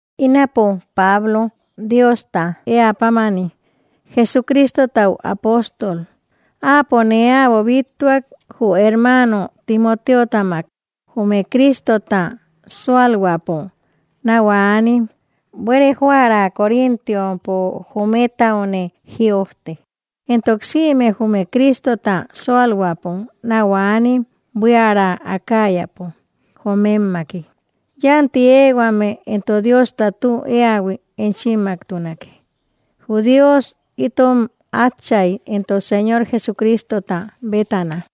Ínapo, Pablo, Diosta eä pámani, Jesucristotau apóstol, áapo nee äbo bíttuak, jü hermano Timoteotamak, jume Cristota sualhuäpo nau anim buere joära Corintiompo jometaune jïojte, entok sïme jume Cristota sualhuäpo nau anim buiära Acayapo jomemmaki. Yanti ehuame entok Diosta tü eähui enchimmaktunake, jü Dios itom Átchay entok Señor Jesucristota bétana.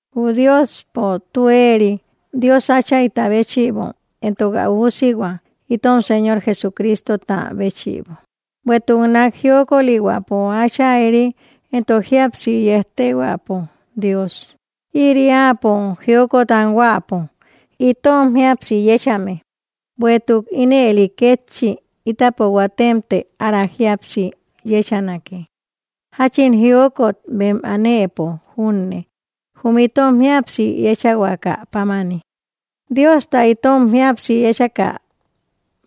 Jü Diospo tü eri Dios áchayta béchïbo entok ä üusihua itom Señor Jesucristota béchïbo, bueïtuk nak jiokolihuäpo Achayri entok jíapsi yejtehuäpo Dios. Ïri áapo jiokot anhuäpo itom jíapsi yechame, bueïtuk ínëli kétchi itapo huatemte ára jíapsi yechanake jachin jiokot bem anëpo junne jum itom jíapsi yechahuaka pámani, Diosta itom jíapsi yechakä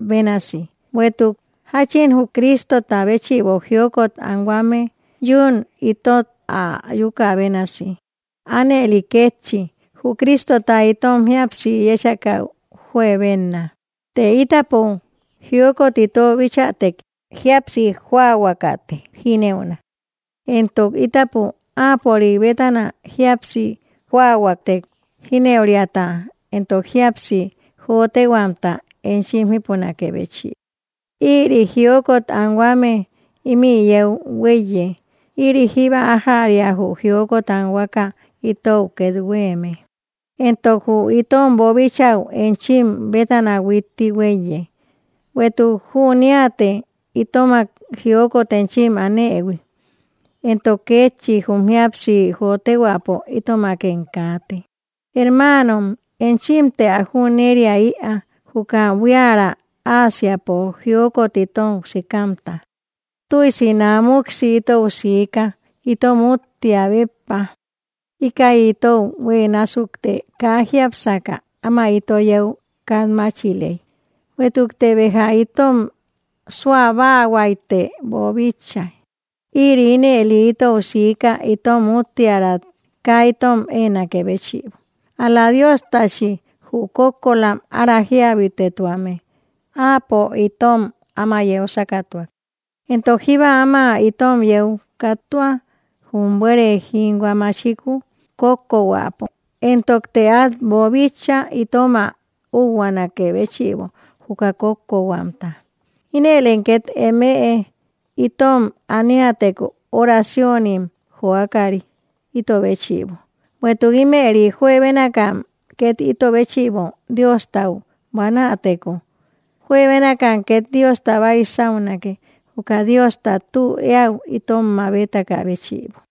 bénasi. Bueïtuk jachin jü Cristota béchïbo jiokot anhuame yún itot ä ayuka bénasi, anëli kétchi jü Cristota itom jíapsi yechähui juebenna. Të, itapo jiokot ito bichätek, jíapsi joahuakate jinëuna; entok itapo Áapörik bétana jíapsi joahuätek, jinëuriata entok jíapsi jotehuamta enchim jipunakë béchïbo, ïri jiokot anhuame imï yeu huéiye ïri jíba ajäria jü jiokot anhuaka itou ket hueme. Entok jü itom boobichäu enchim bétana huitti huéiye, bueïtuk jüniate itomak jiokot enchim anëhui, entok kétchi jum jíapsi jotehuäpo itomakem kaate. Hermanom, enchimte ä jüneria‑ïa juka buiära Ásiapo jiokot itou sïkamta; tüisi namuksi itou sïka itom úttia béppa, íkäi itou hue násukte kaa jiápsaka áma ito yeu katmachiley. Bueïtukte béja itom suabahuaïte boobíchaïhuiy, ïri ínëli itou sika itom úttiärat kaa itom enakë béchïbo, ál‑la Diostachi, jü kókkolam ára jiabitetuame. Áapo itom áma yeu sakatuak, entok jíba áma itom yeu kattua, jum buere jinhua machiku kókko huäpo. Entokte at boobíchaïhui itom ä úhuanakë béchïbo juka kókko huamta, inëlem ket emeë itom aniäteko oraciónim joakari ito béchïbo. Bueïtuk imëri juebénakam ket ito béchïbo Diostau buanäteko, juebénakam ket Diosta baisaunake juka Diosta tü eäu itom mabetakä béchïbo.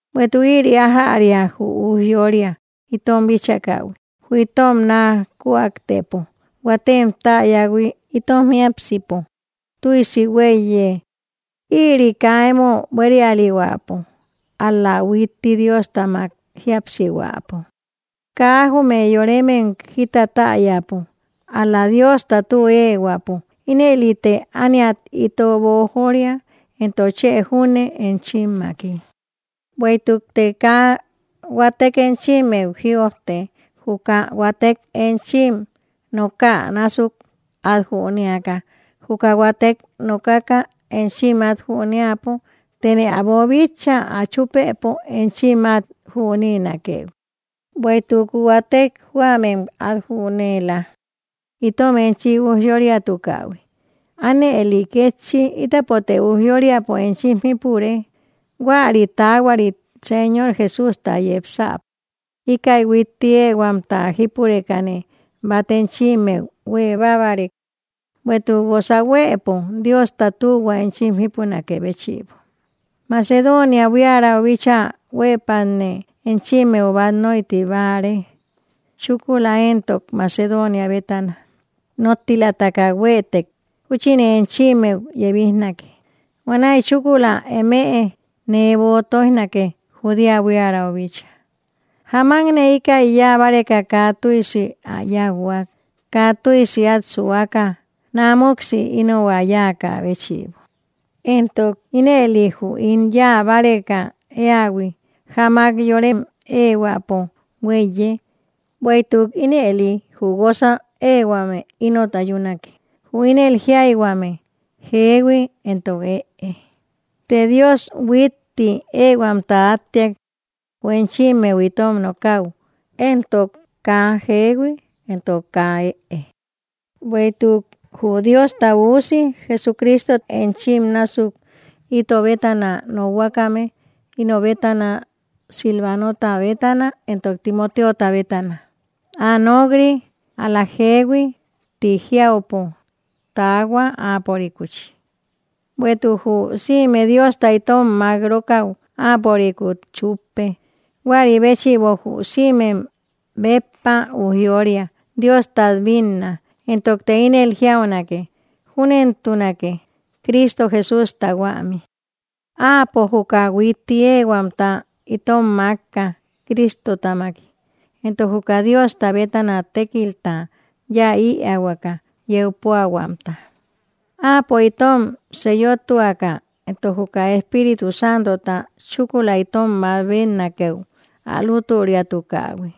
Bueïtuk ïri ajäria jü ujyória itom bíchakähui, jü itom naa kujaktepo huatem täyähui itom jiápsipo tüisi huéiye, ïri kaa emo buérialihuäpo ál‑la huitti Dióstamak jíapsihuäpo. Kaa jume yoremem jita täyapo ál‑la Diosta tü ehuäpo, inëlite ániat ito bojória, entok chë junne enchimmaki. Bueïtukte kaa huatek enchimmeu jïojte, juka huatek enchim nooka násuk at jünéaka juka huatek nokaka enchim at jünëapo. Tene ä boobíchaïhui ä chupëpo enchim at jüneenakëhui, bueïtuk huatek huämem at jüneela, itom enchim ujyóriatukähui anëli kétchi ítapote ujyóriapo enchim jipure, huäri taahuarit Señor Jesústa yepsäpo. Íkäi huitti ehuamta jípurekane, bat enchimmeu huebabarek, bueïtuk guosa huëpo Diosta tühua enchim jipunakë béchbo; Macedonia buiärau bíchaa huepatne enchimmeu bat noitibare, chúkula entok, Macedonia bétana nottilataka, huetek júchine enchimmeu yebijnake. Huanaï chúkula emëe nee böo toijnake Judea buiärau bícha. ¿Jáamakne íkäi yáa báreka kaa tüisi ä yauhuak kaa tüisi at suaka namuksi ino ä yáaka béchïbo? ¿Entok ínëli jü ín yáa bareka eähui jáamak yorem ehuäpo huéiye, bueïtuk ínëli jü guosa ehuame inot ayunake jü ínel jiayhuame “jehui” entok “ëe”? Të Dios huitti ehuamta attiak jü enchimmeu itom nokaü entok, kaa “jehui” entok kaa “ëe”. Bueïtuk jü Diosta Üusi, Jesucristo, enchim násuk ito bétana nokhuakame, ino bétana, Silvanota bétana, entok Timoteota bétana, kaa “ëe” entok “jehui” tï jiaubahuäpo nok‑ri; ál‑la jehui tï jiaupo taahua, áapörikuchi; bueïtuk jü sïme Diosta itom mak‑rokau, áapörikut chuppe. Huari béchïbo, jü sïmek béppa ujyória Diostat bínna, entokte ínel jiaunake “Júnentunake” Cristo Jesústa huämi. Áapo juka huitti ehuamta itom makka Cristotamaki, entok juka Diosta bétana tékilta yáa ïahuaka yeu puahuamta. Áapo itom seeyotuaka entok juka Espíritu Santota chúkula itom mabetnakëu ä lüturiatukähui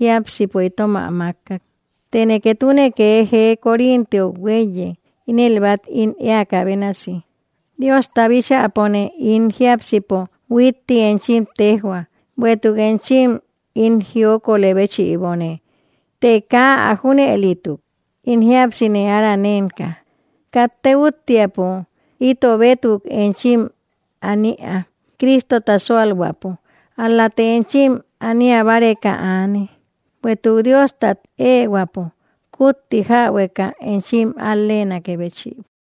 jiápsipo itom ä makkak. Tene ketune kee jee Corintiou huéiye ínel bat ín eäka bénasi, Diosta bíchäpone ín jiápsipo huitti enchim tejhua; bueïtuk enchim ín jiokolë béchïbone; të kaa ä junëlituk, ín jíapsine ára nenka. Katte úttiapo ito bétuk enchim an‑ïa Cristota sualhuäpo, ál-late enchim aniabareka aane, bueïtuk Diostat ehuäpo kutti jäbueka; enchim al‑lenakë béchïbo.